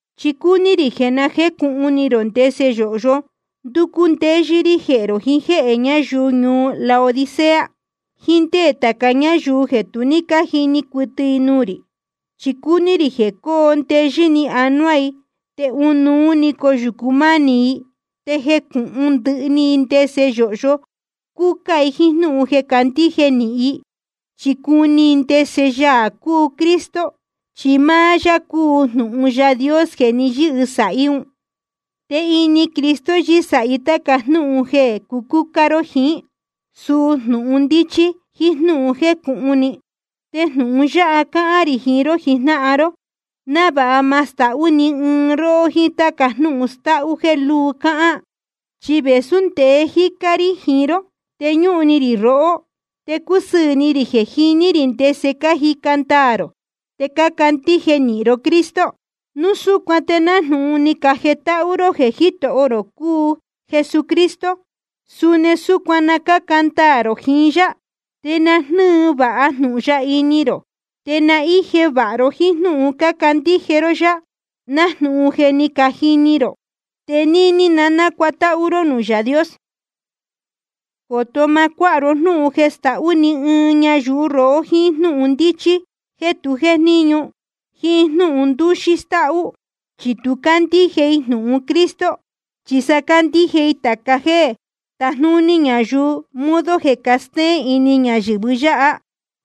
Chi cúní rī jeē na jécūhun ni rō ndese yōhyo ndúcú ndéyɨ́ rí jehē rō, jiín jéhē ñayuu ñuu Laodicea, jiín ndé tāca ñáyuu jeē tu ní cájini cuɨtɨ nuū rī. Chi cúní rī jeē coo ndeyɨ́ ni anuá i, te ɨnuú‑ni coyūcu mánī i, te jecūhun ndɨhɨ ni i ndese yōhyo cúcá i jíín jnúhun jeē candíje nīhin i. Chi cuni i ndese Yaā cúu Cristo, chi máá yá cúu jnūhun Yaā Dios jeē ni yɨ́sāhí un. Te ini Cristo yɨ́sāhí tāca jnúhun jeē cucúcá ró jiín, suu jnūhun ndíchí jíín jnúhun jécūhun ni. Te jnūhun yáha cáhán rī jiín ró jijnáhan ró, návāha ma stahú ni ɨɨn i róhó jíín táca jnúhun stáhú jéē lúu cáhán. Chi vēsú ndeé jícá rí jiín ró, te ñúhun ni rī rohó, te cúsɨɨ̄ ni rī jeē jiní rī ndese cájica ndaā rō te cácandíje nīhin ró Cristo. Núu súcuan te nájnūhun ni cajetáhú ró jeē Jítoho rō cúu Jesucristo, suni súcuan na cáca ndaā rō jiín yá. Te na jnɨ́ɨ vāha jnūhun ya ini rō, te na íje vāha ró jíín jnúhun cácandíje ró yá, nájnūhun je ni cajini rō. Te níní nacuatáhú ró nuū Yaā Dios. Coto má cuāha ró jnúhun jeē stahú ni ɨɨn ñayuu rohó jíín jnúhun ndíchí jéē tu jéjníñu, jíín jnúhun ndúxí stáhú. Chi tu cácandíje i jnūhun Cristo, chi sa cácandíje i tāca jéē tajnúní ñayuu, modo jeē castéén ini ñayɨ̄vɨ yáha.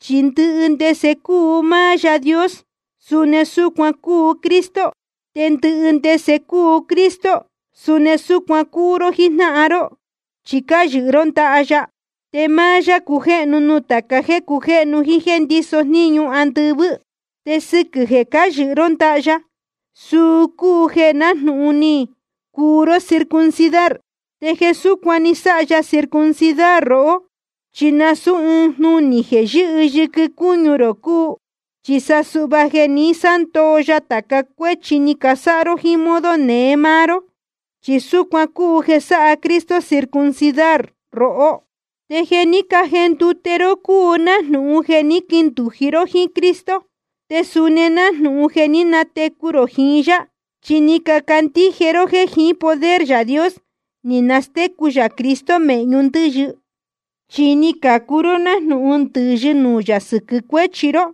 Chi ndɨhɨ ndese cúu máá Yaā Dios, suni súcuan cúu Cristo. Te ndɨhɨ ndese cúu Cristo, suni súcuan cúu ró jíjnáhan ró, chi cáyɨhɨ ró ndaha ya. Te máá yá cújéhnu nuū tāca jéē cujéhnu jíín jéē ndíso jníñu andɨvɨ́. Te sɨquɨ̄ jeē cáyɨhɨ ró ndaha ya, suu cúu jeē nájnūhun ni cuu ró circuncidar. Te jeē súcuan ni sáha ya circuncidar rohó, chi nasūú ɨɨn jnunī jeē yɨ́hɨ yɨquɨ cúñu rō cúu, chi sa suhva jeē ní sándoo ya tāca cuéchi ni casáha ró jíín modo neé máá ró. Chi súcuan cúu jeē sáha Cristo circuncidar rohó. Te jeē ní cajendute ró cúu nájnūhun jeē ní quindūji ró jíín Cristo, te suni nájnūhun jeē ní natecu rō jiín yá. Chi ni cacandíje ró jéē jiín poder Yaā Dios ni nastécu yā Cristo mēhñu ndɨ́yɨ. Chi ni cacuu ró nájnūhun ndɨ̄yɨ nuū yā sɨquɨ̄ cuéchi ró,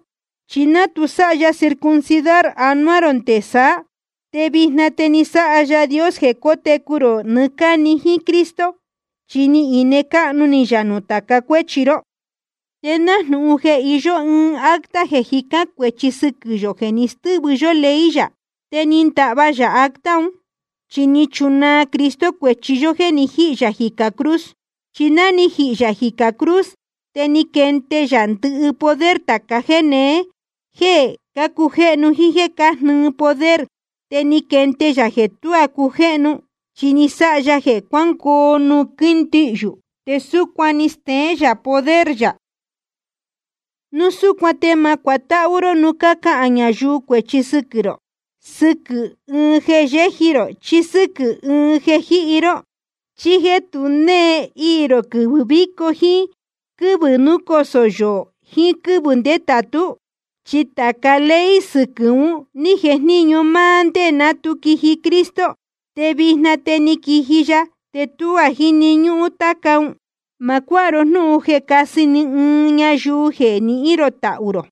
chi ná tu sáha ya circuncidar anuá rō nde saá. Te vijna te ni sáha Yaā Dios jeē cotecu rō nɨɨ́ cáni jíín Cristo, chi ni ine cáhnu ni yā nuū tāca cuéchi ró. Te nájnūhun jeē iyó ɨɨn acta jeē jicán cuēchi sɨquɨ̄ yō jeē ni stɨ́vɨ yó ley yā. Te ni ndahva yā acta un, chi ni chunaa Cristo cuēchi yó jéē ni jíhī yā jicā cruz. Chi ná ni jihī yā jicā cruz, te ni quende yā ndɨhɨ poder tāca jéneé jéē cácujéhnu jíín jéē cájnɨɨ poder. Te ni quende yā jeē tuá cujéhnu, chi ni sáha ya jeē cuángoo nuū quíndihyū, te súcuan ni steén yā poder yā. Núu súcuan te ma cuatáhú ró núu cácahān ñayuu cuēchi sɨquɨ̄ rō, sɨquɨ̄ ɨɨn jeē yéji rō chí sɨ́quɨ̄ ɨɨn jeē jíhi ró, chí jéē tu née iī rō quɨvɨ̄ víco jíín quɨ́vɨ̄ núcosō yoō jiín quɨ́vɨ̄ ndétātú. Chi tāca ley sɨquɨ̄ un ní jejníñu máá ndé ná tu quiji Cristo. Te vijna te ni quiji ya te tuá jíni ñúhún táca ún. Ma cuáha ro jnúhun jeē cásɨ ni ɨɨn ñayuu jeē nihín rō tahū rō.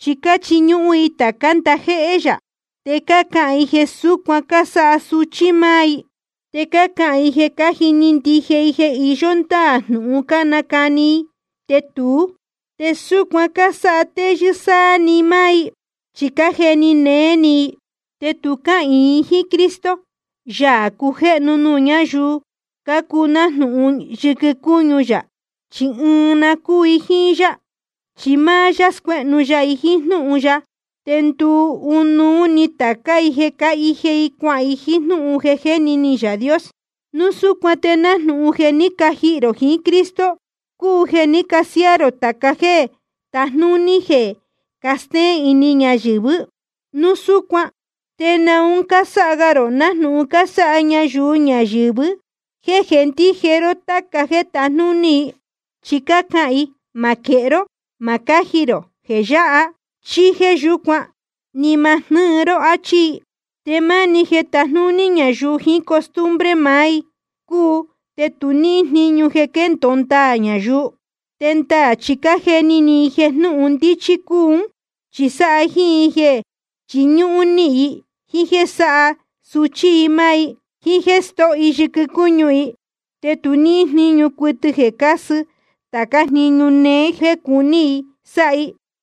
Chi cáchiñúhún i tācá ndajéhé yā, te cácahān i jeē súcuan cásáha suchí i máá i. Te cácahān i jeē cájini ndije i jeē iyó ndáā jnūhun cánacani i, te tuú. Te súcuan cásáha téyɨ́ sáá‑ni i máá i, chi cájeni néé ni i. Te tu cáhīin i jíín Cristo, Yaā cujéhnu nuū ñáyuu cácuu nájnūhun yɨquɨ cúñu yā chi ɨɨn na cúu i jíín yá. Chi máá yá scuéhnu ya i jíín jnúhun ya, te nduu ɨnuú ni tācá i jeē cáhije i cuahān i, nájnūhun ni jeni ni Yaā Dios. Núu súcuan te nájnūhun jeē je ni cajihī rō jiín Cristo, cúu jeē ní casiáá rō tāca jéē tajnúní jeē castéén ini ñayɨ̄vɨ́. Núu súcuan ¿te naun cásáha ga rō nájnūhun cásáha ñayuu ñayɨ̄vɨ jéē jéndije ró táca jéē tajnúní i? Chi cácahān i: Ma quehé ró ma cáji rō jeē yáha chí jéē yúcuan, ni ma jnɨ́ɨ ró, áchí i. Te máni jeē tajnúní ñayuu jiín costumbre maá i cúu te tu níhín jníñu jeē quéndōo ndaā ñayuu. Te ndaā chi cájeni ni i jeē jnúhun ndíchí cúu ún, chi sáha jíín i jeē chiñúhún níhin i, jíín jéē sáha suchí i máá i, jíín jéē stóho i yɨquɨ cúñu i. Te tu níhín jníñu cuɨtɨ jeē casɨ tācá jniñu néé jéē cuní i sáha i.